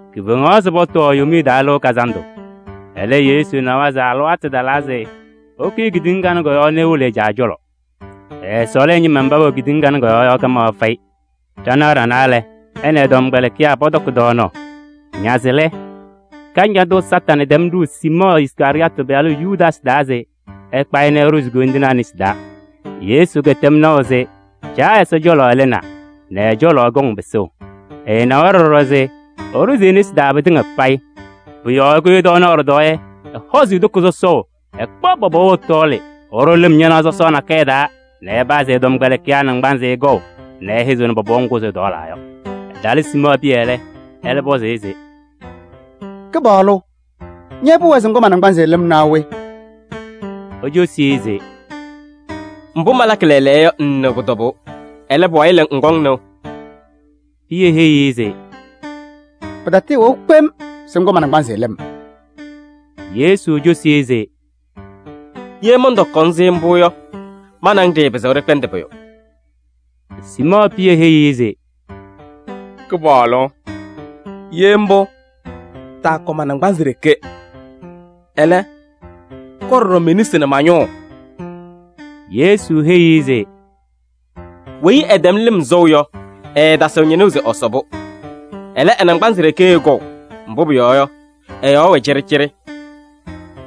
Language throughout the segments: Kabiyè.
Kifeŋaɣ se pɔtɔɔ Yomiye Taa Lɩʋ Kazandʋ. Ɛlɛ Yesu na se ɛ-alɩwaatʋ talaa se ɛkʋyɩ kedeŋa kanɛ kɔ-yɔɔ nɛ ewolo ɛ-Caa cɔlɔ. Ɛɛsɔɔlɩ ɛ-ñɩma mba pɛwɛ kɔ-yɔɔ yɔ kamaɣ fɛyɩ. Ɖanaɣ ɖanaa lɛ, ɛ nɛ ɛ-tɔmkpɛlɩkɩyaa pɔtɔkɩ tɔɔnaɣ. Naze lɛ, Kañadʋ Satanɩ tɛm ɖʋʋ Siimɔɔ Iskarɩyɔɔtɩ pɩyalʋ Yudaasɩ taa se ɛkpa-ɩ nɛ ɛɖʋzɩ koyindinaa nesi taa. Yesu kɛtɛm naʋ se Caa Ɛsɔ cɔlɔ ɛlɩnaa nɛ ɛ-cɔlɔ ɛkɔŋ pɩsʋʋ. Ɛnawa ɖɔɖɔ se ɛɖʋzɩ e-nesi taa pɩtɩŋa payɩ. Pʋ-yɔɔ ɛkʋyɩ tɔɔnaɣ ɖɩtɔɔyɛ nɛ ɛhɔzɩ e-toko sɔsɔʋ nɛ ɛkpaɣ pɔpɔʋ ɛtɔɔlɩ nɛ ɛɖʋ lɩm ñanaɣ sɔsɔɔ nakɛyɛ taa nɛ ɛpazɩ ɛ-tɔmkpɛlɩkɩyaa naŋgbanzɩ kɔʋ nɛ ɛhɛzɩɣnɩ pɔpɔʋ ŋgʋ ɛtɔɔlaa yɔ. Ɛtalɩ Siimɔɔ Pɩyɛ lɛ, ɛlɛ pɔzɩ-ɩ se: “Kɩpaɣlʋ! Ña pʋwɛɛ se ŋkɔ ma-naŋgbanzɩ lɩm naa we?” Ecosi-i se: “Mbʋ malakɩ lɛɛlɛɛyɔ yɔ, ŋŋnɩɣ pʋ-tɔbʋʋ. Ɛlɛ, pʋwayɩ lɛ, ŋkɔŋ nɩʋ.” Pɩyɛ heyi-i se: “Pɩtatɩɩwɛʋ kpem se ŋkɔ-m ma-naŋgbanzɩ lɩm!” Yesu cosi-i se: “Ye mɔntɔkɔ-ŋ-sɩ mbʋ yɔ, ma nɛ ŋ ɖɩɩpɩzɩɣ ɖɩkpɛndɩ pʋyʋ.” Siimɔɔ Pɩyɛ heyi-i se: “Kɩpaɣlʋ! Ye mbʋ, taakɔ ma-naŋgbanzɩ ɖeke. Ɛlɛ, kɔ-m ɖɔɖɔ me-nesi nɛ ma-ñʋʋ!” Yesu heyi-i se: “Weyi ɛtɛm lɩm sɔʋ yɔ, ɛɛtasɩɣ ñɩnʋʋ se ɛsɔ-pʋ. Ɛlɛ, ɛ-naŋgbanzɩ ɖeke ɛkɔʋ, mbʋ pʋyɔɔ yɔ, ɛ-yɔɔ wɛ cɩɖɩcɩɖɩ.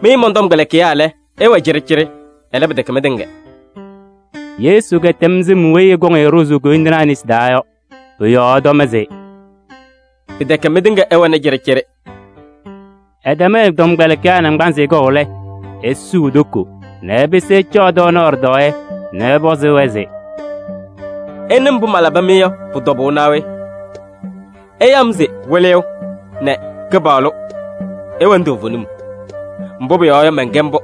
Mɩ mɔn-tɔmkpɛlɩkɩyaa lɛ, ɩwɛ cɩɖɩcɩɖɩ, ɛlɛ, pɩtɛkɛ mɩtɩŋa.” Yesu kɛtɛm sɩm weyi ɛkɔŋ-ɩ ɖʋzʋʋ koyindinaa nesi taa yɔ, pʋ-yɔɔ ɛtɔm se: “Pɩtɛkɛ mɩtɩŋa ɩwɛnɩ cɩɖɩcɩɖɩ.” Ɛtɛm ɛ-tɔmkpɛlɩkɩyaa naŋgbanzɩ kɔʋ lɛ, esuu e-toko nɛ ɛpɩsɩ ɛcaɣ tɔɔnaɣ ɖɩtɔɔyɛ nɛ ɛpɔzɩ-wɛ se: “Ɩnɩ mbʋ malabɩ-mɩ yɔ pʋ-tɔbʋʋ naa we? Ɩyaɣ-m se: ‘Wɩlɩyʋ’ nɛ ‘Kɩpaɣlʋ.’ Ɩwɛnɩ toovenim, mbʋ pʋyɔɔ yɔ, mɛnkɛ mbʋ.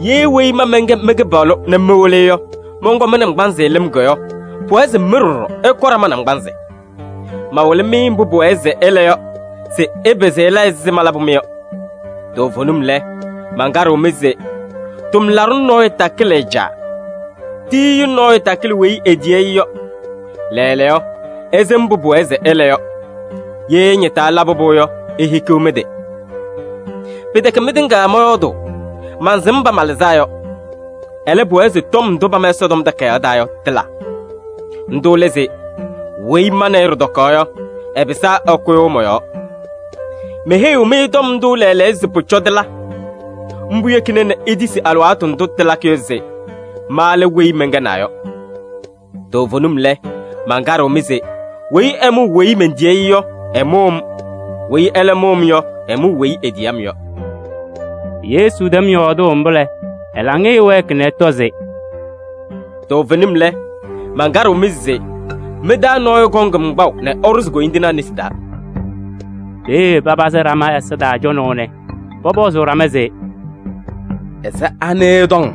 Ye weyi ma mɛnkɛ mɩ-Kɩpaɣlʋ nɛ mɩ-Wɩlɩyʋ yɔ, mɔnkɔ mɩ-naŋgbanzɩ lɩm yɔ, pʋwɛɛ se mɩ ɖɔɖɔ, ɩkɔ ɖama naŋgbanzɩ. Mawɩlɩ-mɩ mbʋ pʋwɛɛ se ɩla yɔ se ɩpɩzɩ ɩla ɛzɩ malabʋ-mɩ yɔ. Toovenim lɛ, mankaɖɩɣ-mɩ se: tʋmlaɖʋ nɔɔyʋ takɩlɩ ɛ-caa, tiyiyu nɔɔyʋ takɩlɩ weyi etiyi-i yɔ. Lɛɛlɛɛyɔ, ɩsɩm mbʋ pʋwɛɛ se ɩla yɔ. Ye ɩñɩtaa ɩlabɩ-pʋ yɔ, ihikiɣ mɩ-tɩ! Pɩtɛkɛ mɩtɩŋa mɔyɔɔdʋʋ, mansɩm mba malɩzaa yɔ. Ɛlɛ, pʋwɛɛ se tɔm ndʋ pama Ɛsɔtɔm Takayaɣ taa yɔ, tɩla. Ndʋ lɛ se: ‘Weyi ma nɛ ɩ ɖɩtɔkaɣ yɔ, ɛpɩsaa ɛkʋyʋʋ mɔ-yɔɔ.’ Meheyiɣ-mɩ tɔm ndʋ lɛɛlɛɛyɔ se pʋcɔ tɩla. Mbʋ yekina nɛ itisi alɩwaatʋ ndʋ tɩlakɩ yɔ se: ‘Ma lɛ weyi mɛnkɛnaa yɔ.’ Toovenim lɛ, mankaɖɩɣ-mɩ se: weyi ɛmʋʋ weyi mentiyi-i yɔ, ɛmʋʋ-m. Weyi ɛlɛ mʋʋ-m yɔ, ɛmʋʋ weyi etiyi-m yɔ.” Yesu tɛm yɔɔdʋʋ mbʋ lɛ, ɛ-laŋɩyɛ wɛɛkɩ nɛ ɛtɔ se: “Toovenim lɛ, mankaɖɩɣ-mɩ se: mɩ-taa nɔɔyʋ kɔŋ-m kpaʋ nɛ ɛɖʋzɩ koyindinaa nesi taa.” Peeye papazɩ ɖama ɛza taa cɔnaʋ nɛ pɔpɔzʋʋ ɖama se: “Ɛzɩ anɩ ɛtɔŋ?”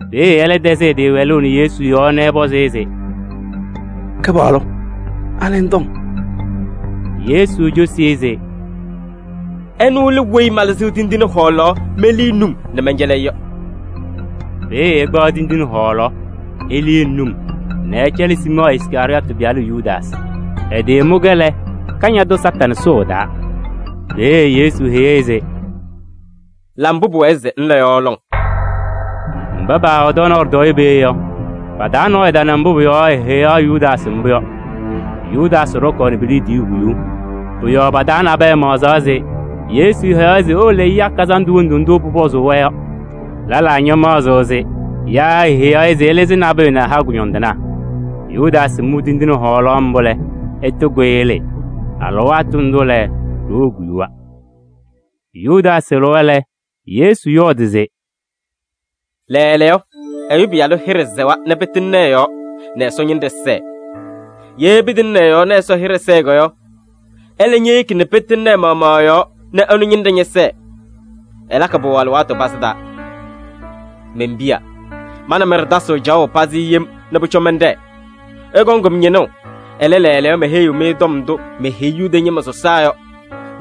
Peeye ɛlɛ tɛzɩ ɛ-tɩ wɛlʋʋ nɛ Yesu yɔɔ nɛ ɛpɔzɩ-ɩ se: “Kɩpaɣlʋ! Anɩ ŋtɔŋ?” Yesu cosi-i se: “Ɛnʋ lɛ weyi malɩzɩɣ tindine hɔɔlaɣ melii num nɛ mɛncɛlɩ-ɩ yɔ.” Peeye ɛkpaɣ tindine hɔɔlaɣ elii num nɛ ɛcɛlɩ Siimɔɔ Iskarɩyɔɔtɩ pɩyalʋ Yudaasɩ. Ɛtɩmʋ-kɛ lɛ, eke Kañadʋ Satanɩ. Peeye Yesu heyi-i se: “La mbʋ pʋwɛɛ se ŋla yɔ lɔŋ!” Mba paawɛ tɔɔnaɣ ɖɩtɔɔyɛ peeye yɔ, pa-taa nɔɔyʋ tana mbʋ pʋ-yɔɔ eheyaɣ Yudaasɩ mbʋ yɔ. Yudaasɩ ɖɔkaɣnɩ pe-liidiye huyuu. Pʋ-yɔɔ pa-taa nabɛyɛ maɣzaɣ se Yesu heyaɣ-ɩ se ewolo ɛya kazandʋ wondu ndʋ pʋpɔzʋʋ-wɛ yɔ. Lɛlaa ñamaɣzɩɣ se yaa eheyaɣ-ɩ se ɛlɩzɩ nabʋyʋ nɛ ɛha kʋñɔndɩnaa. Yudaasɩ mʋ tindine hɔɔlaɣ mbʋ lɛ, ɛtɩkʋyɩ ɛlɩɩ. Alɩwaatʋ ndʋ lɛ, ɖoo koyuwa. Yudaasɩ lɩwa lɛ, Yesu yɔɔdɩ se: “Lɛɛlɛɛyɔ Ɛyʋ Pɩyalʋ hɩɖɛ sɛwa nɛ pɩtɩŋnɩ ɛ-yɔɔ nɛ Ɛsɔ ñɩnɖɛ sɛɛ. Ye pɩtɩŋnɩ ɛ-yɔɔ nɛ Ɛsɔ hɩɖɛ sɛɛ yɔ, ɛlɛ ñeyeki nɛ pɩtɩŋnɩ ɛ-maɣmaɣ ɛ-yɔɔ nɛ ɛnʋ ñɩnɖɛ ñɛsɛɛ. Ɛlakɩ-pʋ alɩwaatʋ pazɩ taa. Men-piya! Ma nɛ mɩ ɖɩtasɩɣ caɣʋ pazɩ yem nɛ pʋcɔ mɛnɖɛɛ. Ɩkɔŋ-m ñɩnʋʋ, ɛlɛ, lɛɛlɛɛyɔ meheyiɣ-mɩ tɔm ndʋ meheyi Yuda ñɩma sɔsaa yɔ.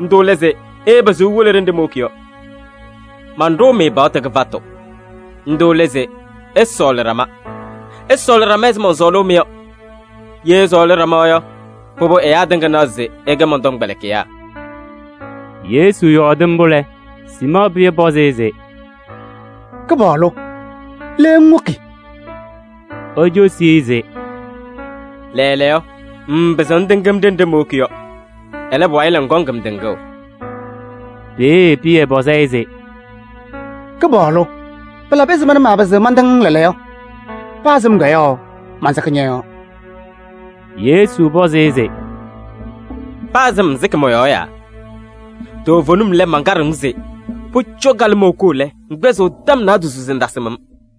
Ndʋ lɛ se: ɩɩpɩzɩɣ iwolo ɖenɖe mowoki yɔ. Manɖʋʋ-mɩ paɣtʋ kɩfatʋ. Ndʋ lɛ se: ɩsɔɔlɩ ɖama. Ɩsɔɔlɩ ɖama ɛzɩ mɔnsɔɔlʋʋ-mɩ yɔ. Ye ɩsɔɔlɩ ɖama yɔ, pʋbʋ ɛyaa tɩŋa naɣ se ɩkɛ mɔn-tɔmkpɛlɩkɩyaa.” Yesu yɔɔdɩ mbʋ lɛ, Siimɔɔ Pɩyɛ pɔzɩ-ɩ se: “Kɩpaɣlʋ! Le ŋwoki?” Ecosi-i se: “Lɛɛlɛɛyɔ, ŋŋpɩzɩɣ ŋtɩŋ-m ɖenɖe mowoki yɔ. Ɛlɛ, pʋwayɩ ŋkɔŋ-m tɩŋʋʋ.” Peeye Pɩyɛ pɔzɩ-ɩ se: “Kɩpaɣlʋ! Pɩlabɩ ɛzɩma nɛ maapɩzɩɣ mantɩŋ-ŋ lɛɛlɛɛyɔ? Paa sɩm yɔ, mansɩkɩ ñɔ-yɔɔ!” Yesu pɔzɩ-ɩ se: “Paa sɩm, ŋsɩkɩ mɔ-yɔɔ yaa? Toovenim lɛ, mankaɖɩɣ-ŋ se: pʋcɔ kalɩmɔʋ koo lɛ, ŋkpɛzɩɣ tɔm naadozo se ŋtasɩm-m.”